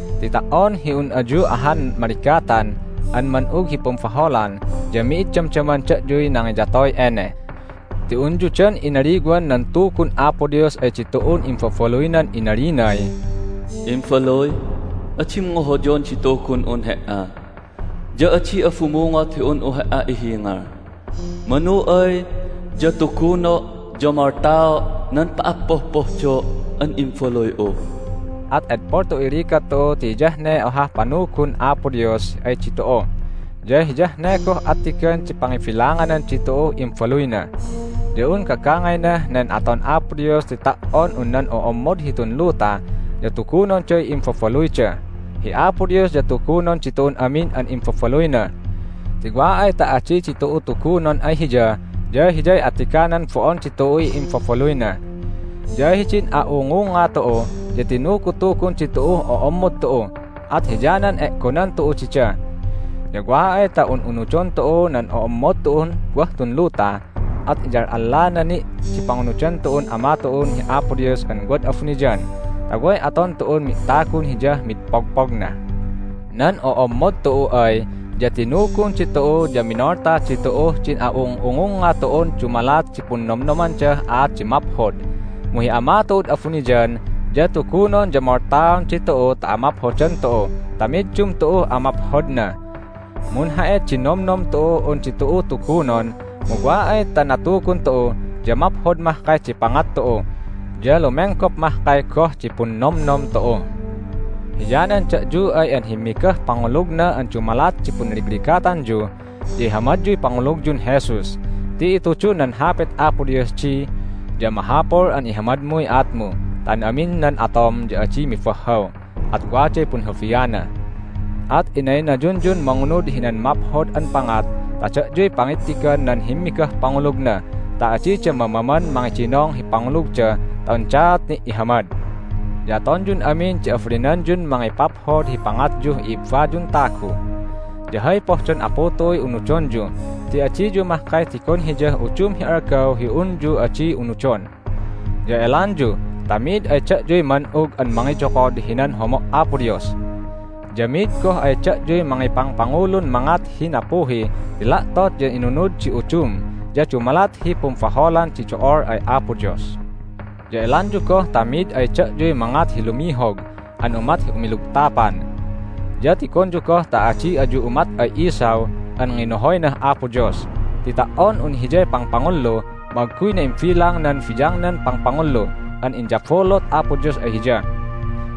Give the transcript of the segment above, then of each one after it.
Ti ta"on hi un ayu ahan maligatan an man'ug hi pumbaholan ya mi'id damdaman da'yuy nangiyatoy ene. Ti unyu dan inaliwan nan Tugun Apo Dios ay ditu'un imbabaluynan inalinay, "Imbaluy, adim ngohoyon di Tugun'un he"a, ya adi'a bumungot hi un'u he"a ihingal. Manu ay ya tuguno' ya moltao' nan pa'appohpohdo' an imbaluy'u." At edpol tu'uy ligat tu'u ti hiyah ne ohah panugun Apo Dios ay ditu'u, ya hiyah ne goh attigan di pangibilanganan ditu'uh imbaluyna. Ya un gagangaynah nen aton Apo Dios ti ta"on un nan o'ommod hitun luta ya tugunonday imbabaluyda. Hi Apo Dios ya tugunon ditu'un amin an imbabaluyna. Ti wa ay ta adi ditu'u tugunon ay Hiya ya hiyay attiganan bo'on ditu'uy imbabaluyna. Ya hidin a'ungunga tu'u ya tinugutugun ditu'uh o'ommod tu'u, at hiyanan e'gonan tu'u dida. Ya wa ay ta un'unudon tu'u nan o'ommod tu'un wah tun luta at inyal'allana ni' di pangunudan tu'un Ama tu'un hi Apo Dios an wad abuniyan ta way aton tu'un mi'tagun Hiyah mid pogpogna! Nan o'ommod tu'u ay ya tinugun ditu'u ya minolta ditu'uh din a'ung'ungungnga tu'un dumalat di punnomnomandah aat di maphod, mu hi Ama tu'ud abuniyan ya tugunon ya moltaon ditu'u ta amaphodan tu'u ta middum tu'uh amaphodna. Munha'it di nomnom tu'uh un ditu'u tugunon, mu wa ay ta natugun tu'u ya maphod mahkay di pangat tu'u, ya lumenggop mahkay goh di punnomnom tu'u. Hiyanan da'yu ay an himmigah pangulugna an dumalat di punligligatanyu ya ihamadyuy pangulugyun Jesus ti itudun nan Hapit Apo Dios di, "Ya mahapul an ihamadmuy aatmu ta an amin nan atom ya adi mibahhaw, at waday punhulbiana." At inaynayunyun mangunud hinan maphod an pangat ta da'yuy pangittigan nan himmigah pangulugna ta adida mamaman mangidinong hi pangulugda ta undaat ni' ihamad. Ya atonyun amin di abalinanyun mangipaphod hi pangatyuh i'ibbayun tagu. Ya hay pohdon Apu tu'uy unudonyu ti adiyu mahkay tigon Hiyah udum hi algaw hi unyu adi unudon. Ya elanyu ta mi'id ay da'yuy man'ug an mangiyokod hinan homo' Apo Dios. Ya mi'id goh ay da'yuy mangipangpangulun mangat hi nappuhi ti la'tot ya inunud di udum ya dumalat hi pumbaholan di do'ol ay Apo Dios. Ya elanyu goh ta mi'id ay da'yuy mangat hi lumihog an umat hi umilugtapan. Ya tigonyu goh ta adi ayu umat ay Esau an nginohoynah Apo Dios ti ta"on un hiyay pangpangullu mu agguyna imbilang nan biyangnan pangpangullu an inyabulut Apo Dios ay hiya.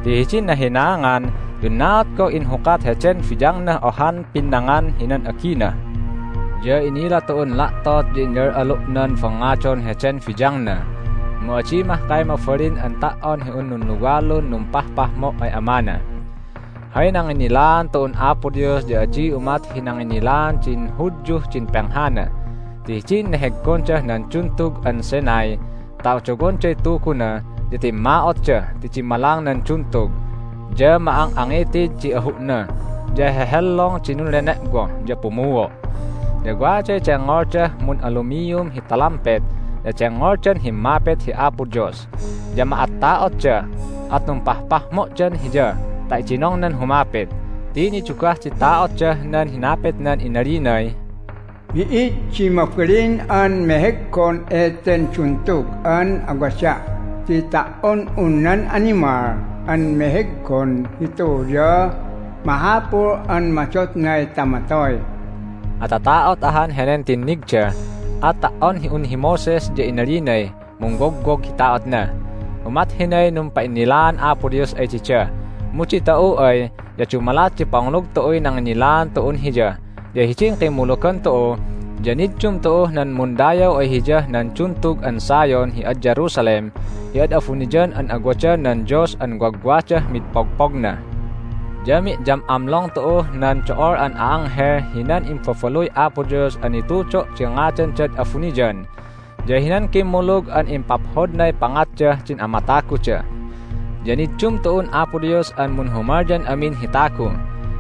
Ti hidin nahinaangan ya unnaat goh inhukat heden biyangnah ohan pinnangan hinan agina. Ya inila tu'un la'tot ya inyal'alu'nan bangngadon heden biyangna, mu adi mahkay mabalin an ta"on hi un nunluwalun numpahpahmo' ay amana. Hay nanginnilaan tu'un Apo Dios ya adi umat hi nanginnilaan din Hudyuh din penghana. Ti hidin neheggondah nan Duntug an Sinai ta odowonday Tuguna ya timma'otda ti dimmalang nan duntug, ya ma"ang'angitid di ahu'na, ya hehellong di nunlene'woh, ya pumuo'. Ya waday dengngoldah mun'alumium hi talampet, ya dengngoldan himmapit hi Apo Dios. Ya ma'atta'otda, at numpahpahmo'dan Hiya ta idinongnan humapit ti nidugah di ta'otdah nan hinapitnan inalinay, "Mi'id di mabalin an meheggon eten duntug an awada' ti ta"on un nan animal an meheggon hitu ya mahapul an madotnay ta matoy." Atata'ot ahan henen tinnigda, at ta"on un hi Moses ya inalinay mungwogwog hi ta'otna. Umat hinay numpa'innilaan Apo Dios ay dida, mu ditu'u ay ya dumalat di pangulug tu'uy nanginnilaan tu'un Hiya. Ya hidin kimmulugan tu'u ya niddum tu'uh nan mundayaw ay Hiyah nan Duntug an Zion hi ad Jerusalem hi ad abuniyan an awadan nan Dios an wagwagdah mid pogpogna. Ya mi'yam'amlong tu'uh nan do'ol an a'anghel hinan imbabaluy Apo Dios an nitudo' di ngadandad abuniyan, ya hinan kimmulug an impaphodnay pangatdah din amataguda. Ya niddum tu'un Apo Dios an munhumalyan amin hi tagu.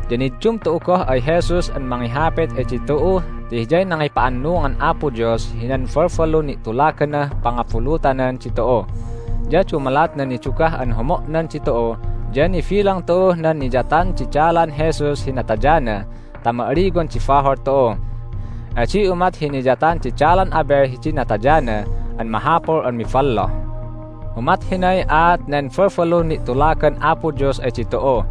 Ya niddum tu'u goh ay Jesus an mangihapit ay ditu'u ti Hiyay nangipa'annungan Apo Dios hinan balbalun ni'tulaganah pangabulutanan ditu'u. Ya dumalat nan nidugah an homo'nan ditu'u ya nibilang tu'uh nan niyatan di dalan Jesus hi natayana ta ma'aliwan di bahol tu'u. Adi umat hi niyatan di dalan Abel hidin natayana an mahapul an miballoh. Umat hinay aat nen balbalun ni'tulagan Apo Dios ay ditu'u,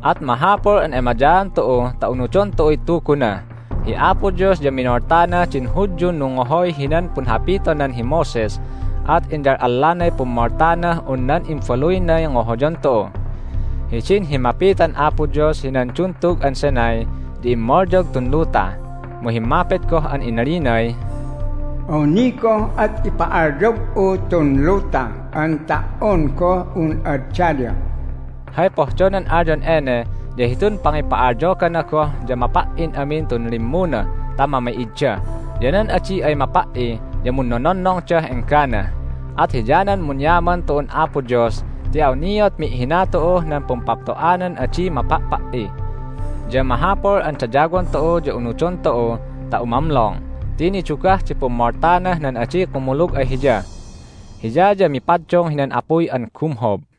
at mahapul an emayaan tu'u ta unudon tu'uy Tuguna. Hi Apo Dios ya minoltana din Hudyun nungngohoy hinan punhapitonan hi Moses, at inyal'allanay pummoltanah un nan Imbaluynay ngohoyon tu'u! Hidin himmapitan Apo Dios hinan Duntug an Sinai ya immalyog tun luta. Mu himmapit goh an inalinay, "Awni goh at ipa'alyog'u tun luta an ta"on goh un ad daya." Hay pohdonan alyon ene ya hitun pangipa'alyogana goh ya mapa"in amin tun limmuna ta mami'idda. Ya nan adi ay mapa"i ya munnononnongdah enggana. At hiyanan munyaman tu'un Apo Dios ti awniat mi'hina tu'uh nan pumpapto'anan adi mapa'pa"i. Ya mahapul an dayawon tu'u ya unudon tu'u ta umamlong ti nidugah di pummoltanah nan adi kumulug ay Hiya. Hiya ya mipaddung hinan apuy an gumhob.